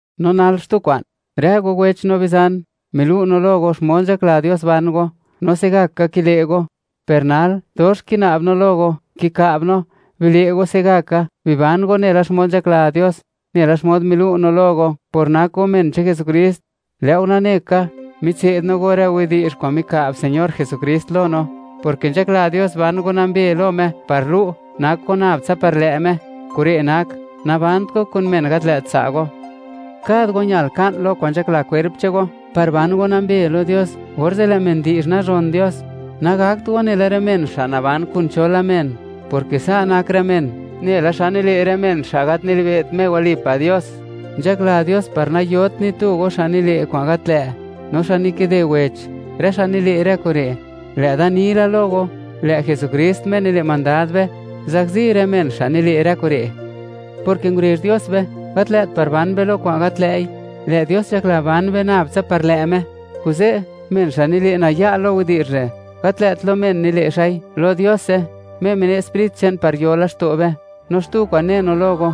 No nal, xtu kwa'n. Rë go wech no bizan, milu' no lo go, xmod nzhakla Dios ban go, no se'gaka kile' go. Per nal dox kina'b no lo go, kika'b no, bile' go se'gaka, biban go nela xmod nzhakla Dios, nela xmod milu' no lo go, por nak go men che'n Jesukrist. Lë' go nane ka, mitse'd no go rë widi'zh kwa'n mika'b Señor Jesukrist lo no, porke nzhakla Dios ban go nambe lo Me par lu', nak go nab tsa par lë' Me; kure' nak, nabant go kun men gat lë' tsa' go. Kad go ñal ka'n lo kwa'n nzhakla kwerp che'n go, par ban go nambe lo Dios, orze' lë' men di'zh nazhon Dios. Nagakt go nela rë men xa' naban kun chola men, porke sa' nak rë men, nela xa nile' rë men xa' gat nilibe't Me walipa' Dios. Nzhakla Dios, par nayot ni tu go xa' nile' kwa'n gat lë', no xa' nikide wech, rë xa' nile' rë kure'. Lë' da ni la lo go, lë' Jesukrist Me nile' mandad be, zakzi rë men xa' nile' rë kure', porke ngurezh Dios be, gat lë't par ban be lo kwa'n gat lë'i; lë' Dios nzhakla ban be nab tsa par lë' Me. Kuze', men xa' nile' naya' lo widi'zh re', gat lë't lo men nile' xa'i; lo Diose, Me mine' Sprit che'n par yo laxto' be. No xtu kwa'n ne no lo go,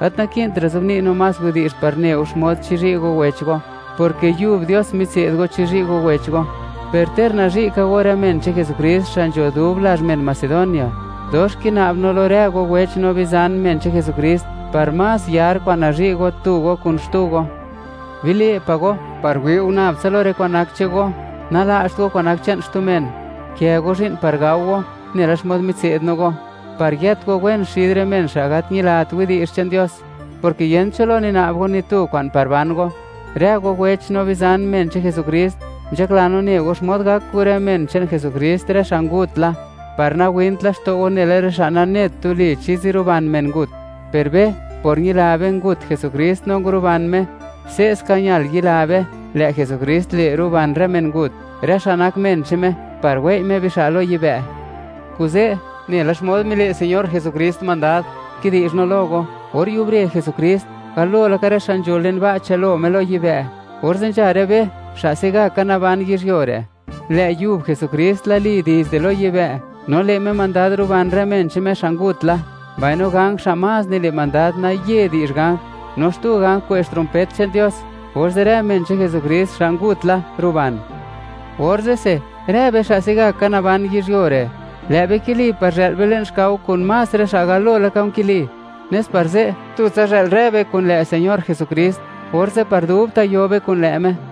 gat naki'ntra' zobni' no más widi'zh par ne go xmod chizhi' go wech go, porke yub Dios mitse'd go chizhi' go wech go. Per ter nazhi' ka go rë men che'n Jesukrist, xa' nzho dub lazh men Macedonia, dox kina'b no lo rë go wech no bizan men che'n Jesukrist, par más yar kwa'n nazhi' go tu go kun xtu go. Bile' pa' go par wi' go nab tsa lo rë kwa'n nak che'n go; nala'cht go kwa'n nak che'n xtu men, gukë go zhi'n par gao go, nela xmod mitse'd no go, par yët go wen xid rë men xa' gat ñilat widi'zh che'n Dios, porke yent cho lo nina'b go ni tu kwa'n par ban go. Rë go wech no bizan, men che'n Jesukrist, nzhakla no ne go xmod gak kun rë men che'n Jesukrist, rë xa' ngut la, par nawint laxto' go nela rë xa' nanet tuli chi ziruban men ngut. Per be, por ñila be ngut Jesukrist no nguruban Me, se'ska ñal yila be, lë' Jesukrist le' ruban rë mengut, rë xa' nak men che'n Me, par wei' Me bixa' lo yibë'. Kuze', nela xmod mile' Señor Jesukrist mandad, kidi'zh no lo go. Or yubre Jesukrist, galo laka rë xa' nzho le'n ba' chë'l lo Me lo yibë'; orze' nzha rë be, xa' se'gaka naban yizhyuo re'. Lë' yub Jesukrist lali dizde lo yibë' no le' Me mandad ruban rë men che'n Me xa' ngut la, mbaino ganj xa' más nile' mandad naye di'zh ganj, no xtu ganj kwe'zh trompet che'n Dios; orze' rë men che'n Jesukrist, xa' ngut la, ruban. Orze'se, rë be xa' se'gaka naban yizhyuo re', lë' be kili par zhë'l be le'n xkao kun más rë xa' galo laka nkili, nes par ze', tutsa zhë'l rë be kun lë' Señor Jesukrist; orze' par dubta' yo be kun lë' Me.